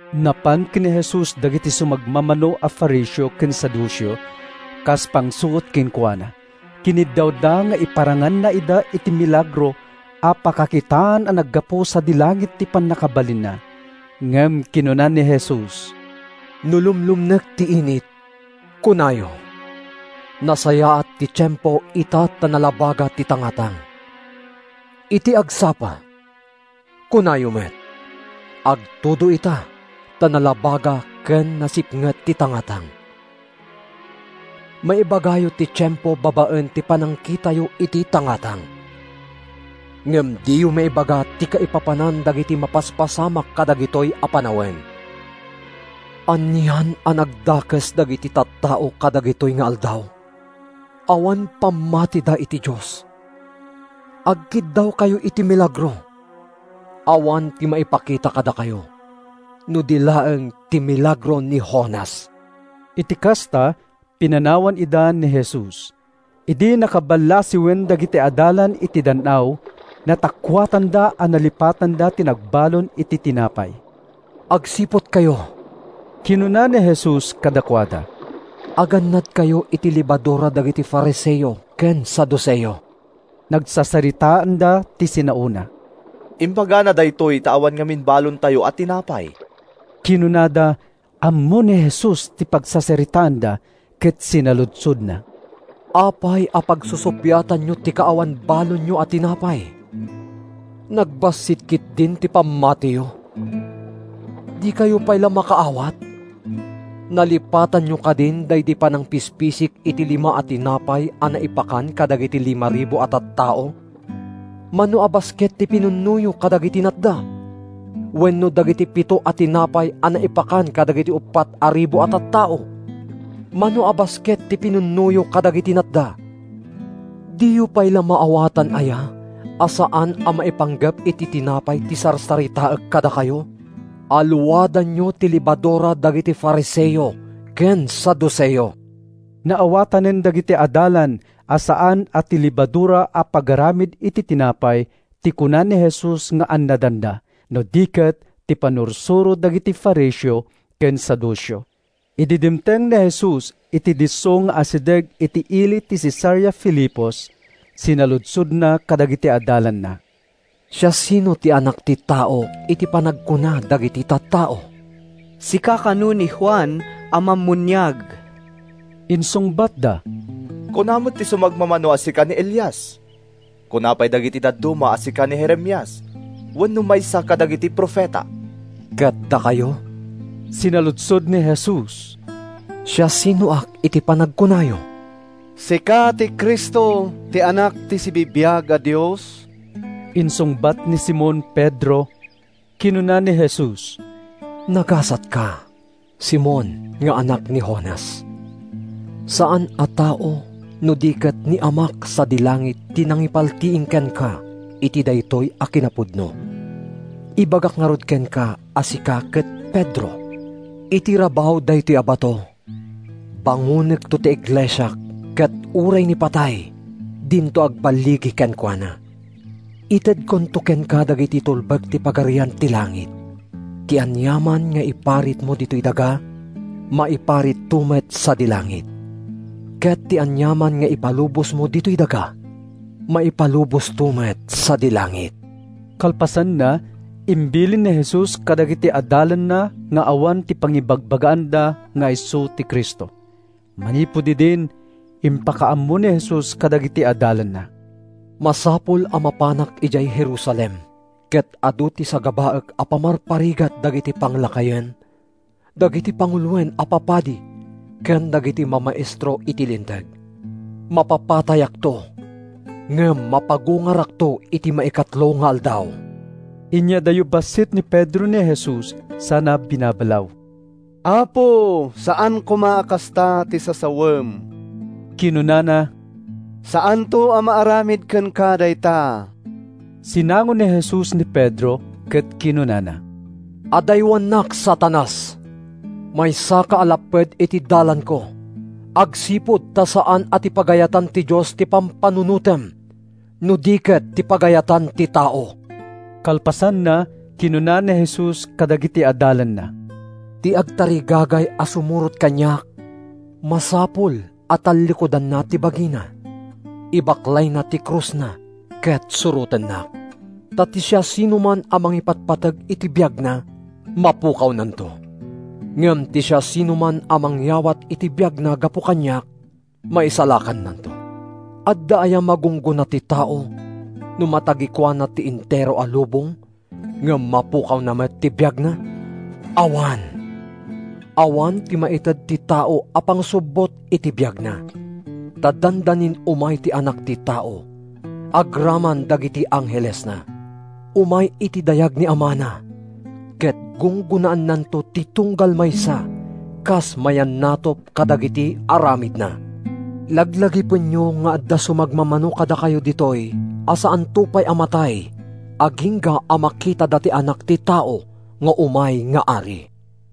Napan ken ni Jesus dagiti sumagmamano a Fariseo ken Saduceo. Kas pangsuot kenkuana, kiniddawda nga iparanganna ida iti milagro a pakakitaan a naggapu sadi langit ti pannakabalinna. Ngem kinuna ni Jesus, “No lumlumnek ti init, kunayo, ‘Nasayaat ti tiempo ita ta nalabaga ti tangatang.’ Iti agsapa, kunayo met, ‘Agtudo ita ta nalabaga ken nasipnget ti tangatang.’ Maibagayo ti tiempo babaen iti panangkitayo iti tangatang. Ngem diyo maibaga ti kaipapanan dagiti mapaspasamak kadagitoy a panawen! Anian a nagdakes dagiti tattao kadagitoy nga aldaw! Awan pammatida iti Dios. Agkiddawkayo iti milagro? Awan ti maipakita kadakayo no di laeng ti milagro ni Jonas.” Iti kasta, pinanawan ida ni Jesus. Idi nakaballasiwen dagiti adalan iti dan-aw, natakkuatanda a nalipatanda ti nagbalon iti tinapay. “Agsiputkayo,” kinuna ni Jesus kadakuada. “Agannadkayo iti lebadura dagiti Fariseo ken Saduceo.” Nagsasaritaanda ti sinaona. “Imbagana daytoy ta awan ngamin balontayo a tinapay,” kinunada. Ammo ni Jesus ti pagsasaritaanda ket sinaludsodna, “Apay a pagsusuppiatanyo ti kaawan balonyo a tinapay? Nagbassit ketdin ti pammatiyo! Dikayo pay la makaawat? Nalipatanyo kadin daydi panangpispisik iti lima a tinapay a naipakan kadagiti limaribu a tattao? Mano a basket ti pinunnoyo kadagiti natda? Wenno dagiti pito a tinapay a naipakan kadagiti uppat a ribu a tattao? Mano a basket ti pinunnoyo kadagiti natda? Diyo pay la maawatan aya a saan a maipanggep iti tinapay ti sarsaritaek kadakayo? Alluadanyo ti lebadura dagiti Fariseo ken Saduceo!” Naawatanen dagiti adalan a saan a ti lebadura a pagaramid iti tinapay ti kuna ni Jesus nga annadanda, no di ket ti pannursuro dagiti Fariseo ken Saduceo. Idi dimteng ni Jesus iti disso nga asideg iti ili ti Cesarea Filipos, sinaludsodna kadagiti adalanna, “Siasino ti Anak ti Tao iti panagkuna dagiti tattao?” “Sika kano ni Juan a Mammuniag,” insungbatda. “Kuna met ti sumagmamano a sika ni Elias. Kuna pay dagiti dadduma a sika ni Jeremias wenno maysa kadagiti profeta.” “Ket dakayo,” sinaludsod ni Jesus, “siasinoak iti panagkunayo?” “Sika ti Cristo, ti Anak ti sibibiag a Dios,” insungbat ni Simon Pedro. Kinuna ni Jesus, “Nagasatka, Simon nga anak ni Jonas. Saan a tao no di ket ni Amak sadi langit ti nangipaltiing kenka iti daytoy a kinapudno. Ibagak ngarud kenka a sika ket Pedro. Iti rabaw daytoy a bato, bangonekto ti iglesiak ket uray ni patay dinto agballigi kenkuana. Itedkonto kenka dagiti tulbek ti Pagarian ti Langit. Ti aniaman nga iparitmo ditoy daga, maiparitto met sadi langit. Ket ti aniaman nga ipalubosmo ditoy daga, maipalubosto met sadi langit.” Kalpasanna, imbilin ni Jesus kadagiti adalanna nga awan ti pangibagbagaanda nga isu ti Cristo. Manipud idin, impakaammo ni Jesus kadagiti adalanna: “Masapul a mapanak idiay Jerusalem ket adu ti sagabaek a pamarparigat dagiti panglakayen, dagiti panguloen a papadi ken dagiti mamaestro iti Linteg. Mapapatayakto ngem mapagungarakto iti maikatlo nga aldaw.” Inyadayo bassit ni Pedro ni Jesus sana binabalaw. “Apo, saan koma a kasta ti sasawem,” kinunana. “Saanto a maaramid kenka dayta.” Sinango ni Jesus ni Pedro ket kinunana, “Adaywannak, Satanas! Maysaka a lapped iti dalanko agsipud ta saan a ti pagayatan ti Dios ti pampanunotem no di ket ti pagayatan ti tao.” Kalpasanna, kinuna ni Jesus kadagiti adalanna: “Ti agtarigagay a sumurot kaniak masapul a tallikudanna ti bagina, ibaklayna ti krusna, ket surotennak. Ta ti siasinoman a mangipatpateg iti biagna, mapukawnanto. Ngem ti siasinoman a mangyawat iti biagna gapu kaniak, maisalakannanto. Adda aya magunggona ti tao no matagikuana ti entero a lubong ngem mapukawna met ti biagna? Awan! Awan ti maited ti tao a pangsubbot iti biagna. Ta dandanin umay ti Anak ti Tao agraman dagiti anghelesna. Umay iti dayag ni Amana, ket gunggonaannanto ti tunggal maysa kas mayannatup kadagiti aramidna. Laglagipenyo nga adda sumagmamano kadakayo ditoy a saanto pay a matay agingga a makitada ti Anak ti Tao nga umay nga Ari.”